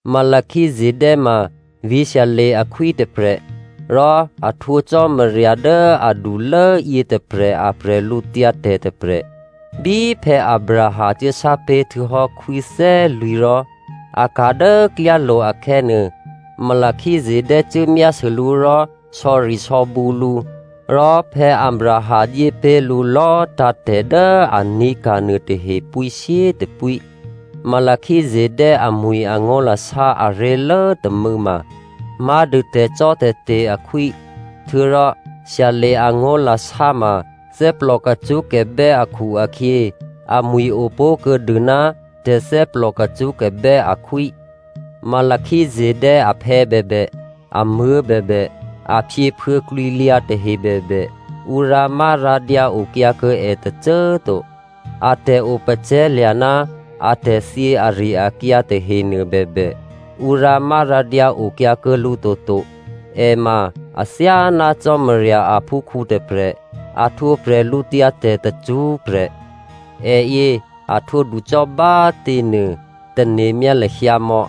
Melchizedè ma vǐ̤ Salem akhwí tôprè̤, rò a htwǒ Cò́marya dố adulố yětôprè̤ a bwídu tôprè̤. Bí Abraham cuốsápé̤ htuô̌hò́ khwí thè́lwǐ̤ rò a ka̤ dố klyálo̤ akhè̌nuô, Melchizedè cuố myásû lǔ rò sò̌risò̌bǔ lǔ. Rò Abraham dyépé̤ lǔ lò̌꤮ tǎ̤tè̤ dố a ní̤ka̤ nuôtahe pwíshyétôpwí. Melchizedè amwi̤ angó̤lasá aré̤lố tômû̌ ma má̤dû “Tè̤cò́tè̤te̤ akhwí.” Htuô̌rò Salem angó̤lasá ma thè́plò kacṳ́kabè́ akhu-akhyě amwi̤ o pó̤kuô̌ dû, “Tè̤thè́plò kacṳ́kabè́ akhwí.” Melchizedè aphè̌ bèbè, amuố̤ bèbè, aphyěphuô̌ klwǐlyǎ tahe bèbè, ǔ rǎmárǎdyǎ okyǎ kuô̌ è tôcô꤮ to. A tè̤opacè̤̌lya̤ ná atè̤thyě ari-akyǎ tahenuô bèbè, ǔ rǎmárǎdyǎ okyǎ kuô̌ lǔ toto. È ma athyáná Cò́marya aphúkhǔ tôprè̤. A htwǒ bwídu tacṳ́prè̤. È yě, a htwǒ ducò́ bá꤮ těnuô tane̤myá lahyǎ mò̌.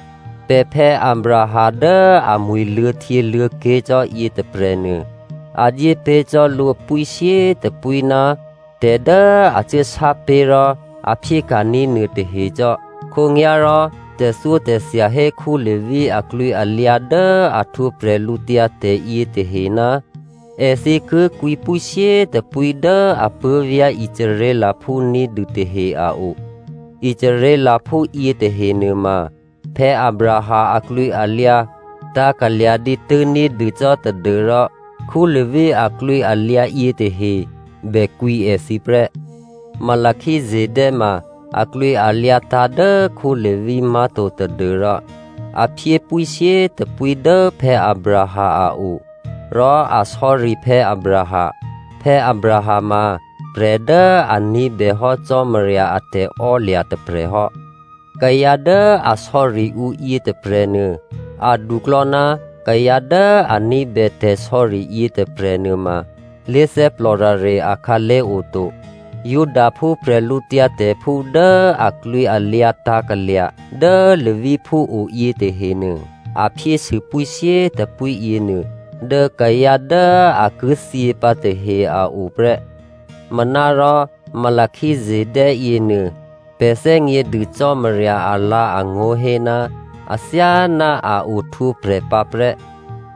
Pè̤phè̌ Abraham dố amwi̤ luô̌htyěluô̌ké̤ cò́ yětôprè̤nuô꤮ a dyépé̤ cò́ lǔ pwíshyétôpwí ná tè̤ dố a cuố sápé̤ rò a phyéka̤ní̤ nuôtahe cò́. Khǒnyá̤rò tè̤thyótè̤thya hé Levi aklwǐalyǎ dố a htwǒ bwídu yětahe, èthǐ ki kwǐ pwíshyétôpwí dố apuố̤vyá̤ Israelphú ní̤dû tahe a o. Israelphú yětahe nuôma, Abraham aklwǐalyǎ tǎ̤kalya̤ dǐtû́ ní̤dû cò́ tadû́rò Levi aklwǐalyǎ yětahe bè kwǐ èthǐ prè́. Melchizedè ma aklwǐalyǎ tǎ̤ dố Levi má̤to tadû́rò a phyé pwíshyétôpwí dố Abraham a o. Rò a sò̌ri Abraham. Abraham ma prè̤ dố a ní̤bèhò́ Cò́marya a tè̤ò́lya̤ tôprè̤ hò́. Kayǎ dố a sò̌ri ǔ yětôprè̤nuô aduklò̌ ná kayǎ dố a ní̤bè tè̤sò̌ri yětôprè̤ nuôma lé̤thè́plò rare akhǎlé̤ oto. Judaphú prè̤lǔtyǎtè̤phú dố aklwǐalyǎ tǎ̤kalya̤ dố Leviphú o yětahenuô, a phyésû pwíshyétôpwí yěnuô dố kayǎ dố a ki thyě pǎ yětahe a o prè́. Manárò Melchizedè yěnuô, pè̤ thè́gnědû Cò́marya alǎ̤angó̤ hé ná athyáná a ohtwǒprè̤ pǎprè́.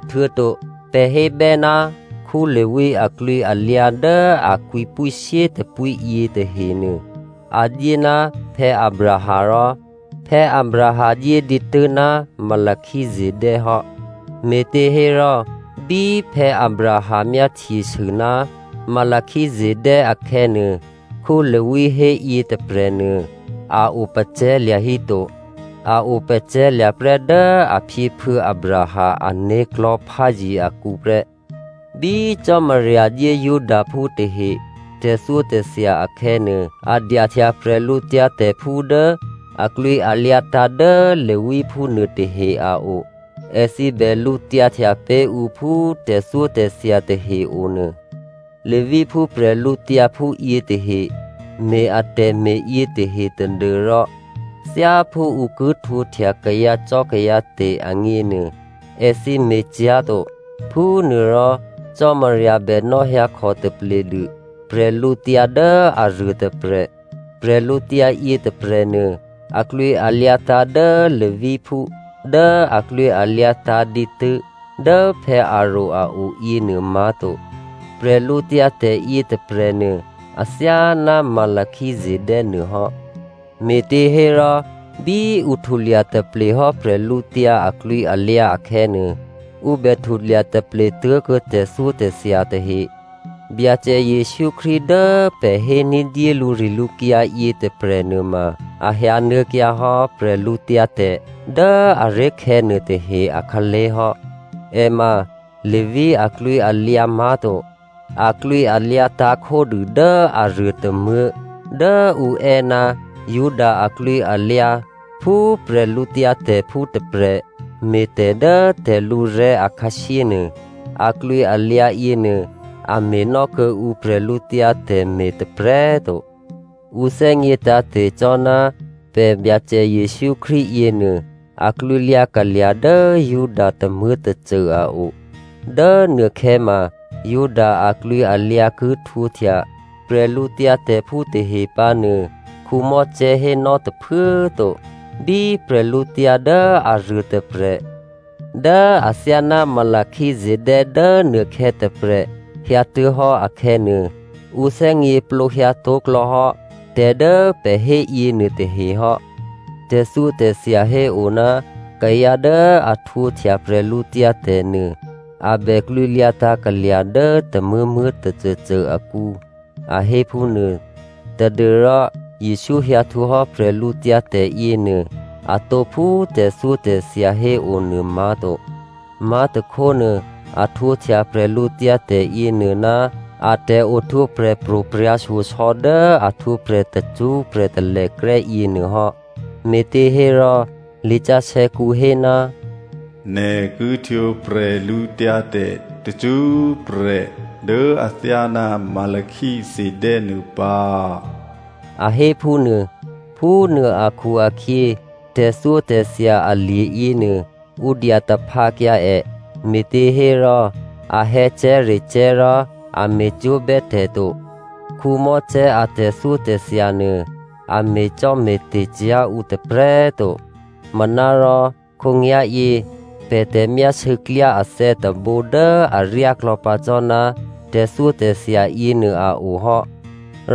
Htuô̌to pè̤ hébè́, Levi aklwǐalyǎ dố a kwǐ pwíshyétôpwí yětahenuô a dyé ná Abraham rò Abraham dyé dǐtû́ ná Melchizedè hò́. Me̤těhérò, bí Abraham myáhtyesû ná Melchizedè akhè̌nuô, Levi hé yětôprè̤nuô, a opacè̤̌lya̤ híto. A opǎprè́ dố aphyěphuô̌ Abraham ané̤klò̤́ pházye akǔ prè́. Bí Cò́marya dyé Judaphú tahe tè̤thyótè̤thya akhè̌nuô, a dyahtya prè̤lǔtyǎtè̤phú dố aklwǐalyǎ tǎ̤ dố Leviphú nuôtahe a o. Èthǐ bè lǔtyǎhtya pé̤ ǔ phú tè̤thyótè̤thya tahe o nuô. Leviphú prè̤lǔtyǎphú yětahe me̤ atè̤me̤ yětahe tadû́rò thyáphú ǔ ki htwǒhtya kayǎcò́kayǎte̤ agněnuô, èthǐ me̤cyá̤to. Phúnuôrò Cò́marya bè nò̌hyǎkhò tapledû prè̤lǔtyǎ dố aruô tôprè̤. Prè̤lǔtyǎ yětôprè̤nuô aklwǐalyǎ tǎ̤ dố Leviphú dố aklwǐalyǎ tǎ̤ dǐtû́ dố Aròn a o yěnuô má̤to. Bwídu yětôprè̤nuô, athyáná Melchizedè nuôhò́. Me̤těhérò bí ǔ htulya taple hò́ prè̤lǔtyǎ aklwǐalyǎ akhè̌nuô, ǔ bè htulya taple tuố̤kuô̌ tè̤thyótè̤thya tahe. Byacè Jesǔ Krístu dố pè̤ hé ní̤dyé lǔrilǔkyǎ yětôprè̤ nuôma, a hyǎnuô̌kyǎ hò́ bwídu dố aré̤khè̌ nuôtahe akhǎlé̤ hò́. È ma Levi aklwǐalyǎ má̤to. Aklwǐalyǎ tǎ̤ khódû dố aruô tômuố̤ dố ǔ è́ ná Juda aklwǐalyǎ phú prè̤lǔtyǎtè̤phú tôprè̤ me̤ tè̤ dố tè̤lǔrè̤́ akhǎshyé nuô, aklwǐalyǎ yěnuô, a me̤nò́ kuô̌ǔ prè̤lǔtyǎ tè̤me̤ tôprè̤꤮ to. Ǔ thè́gně tǎ̤te̤cò́ ná pè̤ Byacè Jesǔ Krístu yěnuô, aklwǐlyǎ kalya̤ dố Juda tômuố̤tôcô a o. Dố nuôkhè̌ ma, Juda aklwǐalyǎ ki htwǒhtya prè̤lǔtyǎtè̤phú tahe pǎ nuô, Mosè hénò́ tôphuố꤮ to. Bí prè̤lǔtyǎ dố aruôtôprè̤ dố athyáná Melchizedè dố nuôkhè̌ tôprè̤ hyǎtuố̤hò́ akhè̌nuô, ǔ thè́gněplǒ hyǎtó̤klò̌hò́ tè̤ dố pè̤ hé yěnuôtahe hò́. Tè̤thyótè̤thya hé o ná kayǎ dố a htwǒhtya bwídu nuô, a bè klwǐlyǎ tǎ̤kalya̤ dố tômuố̤muố̤ tôcôcô akǔ a hé phúnuô, tadû́rò Jesǔ hyǎ htwǒhò́ bwídu yěnuô, atǒ phú tè̤thyótè̤thya héonuô má̤to. Má̤tôkhónuô, a htwǒhtya bwídu yěnuô ná a tè̤ohtwǒprè̤ pro̤prya̤ shyosò̌ dố a htwǒprè̤ tacṳ́prè̤ talèkrè́ yěnuôhò́. Me̤těhérò lisǎsè̌kǔ hé, “Nè̤ ki htwǒ bwídu tacṳ́prè̤ dố athyáná Melchizedè nuô pǎ” a hé phúnuô. Phúnuô akhu-akhyě, tè̤thyótè̤thya alye̤ yěnuô, ǔ dyataphǎkyǎ è me̤těhérò a hè̌cè̤́recè̤́ rò a me̤cwó̤bè́ pè̤ to. Mosè a tè̤thyótè̤thya nuô a me̤cò́me̤te̤ cyá̤ ǔ tôprè̤꤮ to. Manárò khǒnyá̤yě pè̤ tè̤myásû̌ klyá athè̌ tôbǒ dố aryáklò̌ pǎ cò́ ná tè̤thyótè̤thya yěnuô a o hò́.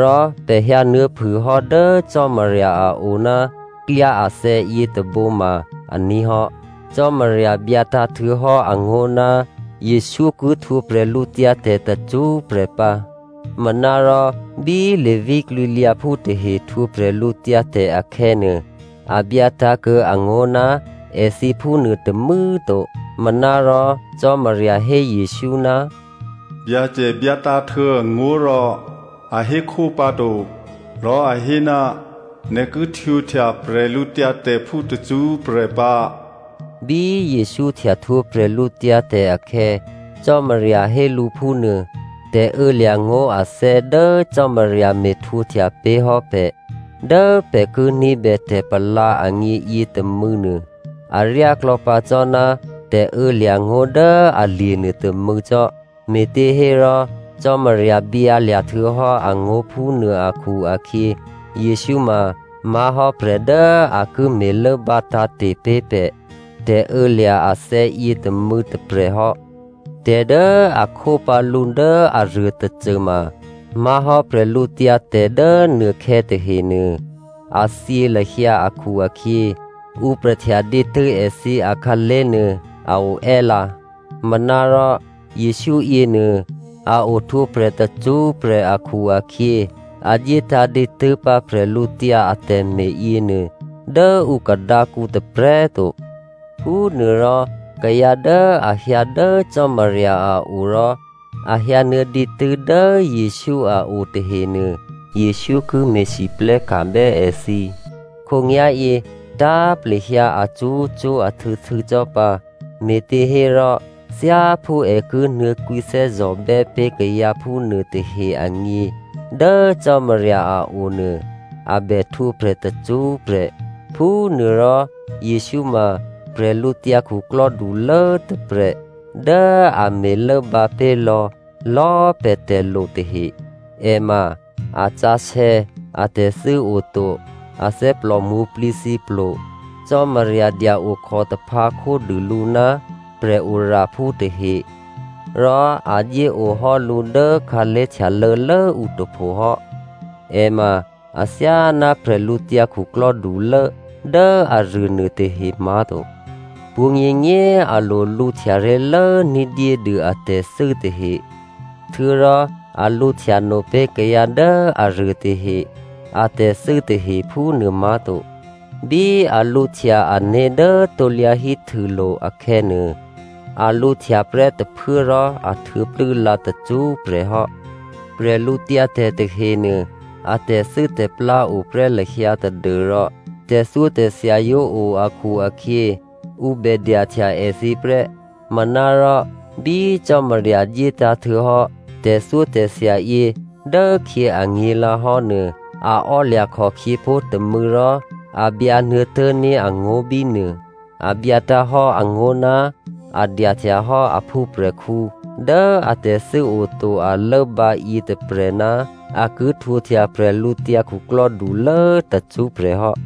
Rò pè̤ hyǎnuô̌phûhò́ dố Cò́marya a o ná klyá athè̌ yětôbǒ ma aní̤ hò́. Cò́marya byǎtǎ̤ htuô̌hò́ angó̤ ná Jesǔ ki htwǒ bwídu tacṳ́prè̤ pǎ. Manárò bí Levi klwǐlyǎphú tahe htwǒ bwídu akhè̌nuô, a byǎ tǎ̤kuô̌ angó̤ ná èthǐ phúnuô tômû̌꤮ to. Manárò, Cò́marya hé Jesǔ, “Byacè byǎtǎ̤htuô̌ angó̤ rò a hékhó pǎto, rò a hé, ‘Nè̤ ki htwǒhtya prè̤lǔtyǎtè̤phú tacṳ́prè̤ pǎ,’” Bí Jesǔ htya htwǒ bwídu akhè̌, Cò́marya hé lǔ phúnuô. Tè̤ô̌lya̤ngó̤ athè̌ dố Cò́marya me̤htwǒhtya pé̤hò́ pè̤ dố pè̤ ki ní̤bè tè̤palǎ agně yětômû̌ nuô, aryá klò̌pǎ cò́ ná tè̤ô̌lya̤ngó̤ dố alye̤ nuôtômû̌ cò́. Me̤těhérò, Cò́marya byǎlya̤ htuô̌hò́ angó̤ phúnuô akhu-akhyě, Jesǔ ma má̤hò́ prè̤ dố a ki me̤lốbǎ tǎ̤te̤ pé̤ pè̤ tè̤ô̌lya̤ athè̌yě tômû̌ tôprè̤ hò́. Tè̤ dố a khó pǎ lǔ dố aruô tôcô ma má̤hò́ bwídu dố nuôkhè̌ tahenuô, a thyě lahyǎ akhu-akhyě ǔ prè̤ htya dǐtû́ èthǐ akhǎlé̤ nuô a o è́lǎ. Manárò Jesǔ yěnuô, a ohtwǒprè̤ tacṳ́prè̤ akhu-akhyě, a dyétǎ̤ dǐtû́ pǎ prè̤lǔtyǎ atè̤me̤ yěnuô dố ǔ khadǎkǔ tôprè̤꤮ to. Phúnuôrò kayǎ dố a hyǎ dố Cò́marya a o rò a hyǎnuô̌ dǐtû́ dố Jesǔ a o tahenuô, Jesǔ ki me̤lwóhteka̤bè́ èthǐ khǒnyá̤yě tǎ̤plehyǎ acṳ́cṳ́ ahtû̌htû̌ cò́ pǎ, me̤těhérò thyáphú è ki nuô̌ kwǐthè́zò̤bè́ pé̤ kayǎ phúnuô tahe agně dố Cò́marya a o nuô, a bè htwǒprè̤ tacṳ́prè̤. Phúnuôrò, Jesǔ ma bwídukhulố tôprè̤ dố a me̤lốbǎ pé̤ lò̌lò̌꤮ pè̤ tè̤lo tahe. È ma a sǎsè̌, atè̤thû́ oto, athè́plò mwǒ̤plǐthǐplo. Cò́marya dya-okhò taphǎ khódû lǔ ná prè̤oraphú tahe, rò a dyéohò́ lǔ dố khǎlé̤ htyalô̌lốǔ tôpho hò́. È ma athyáná bwídukhulố dố aruô nuôtahe má̤to. Pwǒ̤nyěnyě꤮ a lo lǔhtya ré̤lố ní̤dyédû atè̤thû́ tahe htuô̌rò a lǔhtya no pé̤ kayǎ dố aruô tahe atè̤thû́ tahe phúnuô má̤to. Bí a lǔhtya ané̤ dố krusulo̤ akhè̌nuô, a lǔhtya prè́ tôphuố rò a htuô̌plû́ lǎ tacṳ́prè̤ hò́. Bwídu tahenuô, a tè̤thû́tè̤plá o prè́ lahyǎ tadû́rò tè̤thyótè̤thya yǒ o akhu-akhyě, ǔ bè dyahtya èthǐ prè́. Manárò bí Cò́marya dyétǎ̤htuô̌ hò́ tè̤thyótè̤thya yě dốkhyě anyě̤lǎhò́ nuô, a ò́lya̤ khòkhyěpó̤ tômû̌ rò a byǎnuô̌ tố̤ní̤ angó̤ bínuô. A byǎtǎ̤ hò́ angó̤ ná a dyahtya hò́ a phúprè̤khǔ dố atè̤thû́ oto, a lốbǎ yětôprè̤ ná a ki htwǒhtya bwídukhulố tacṳ́prè̤ hò́.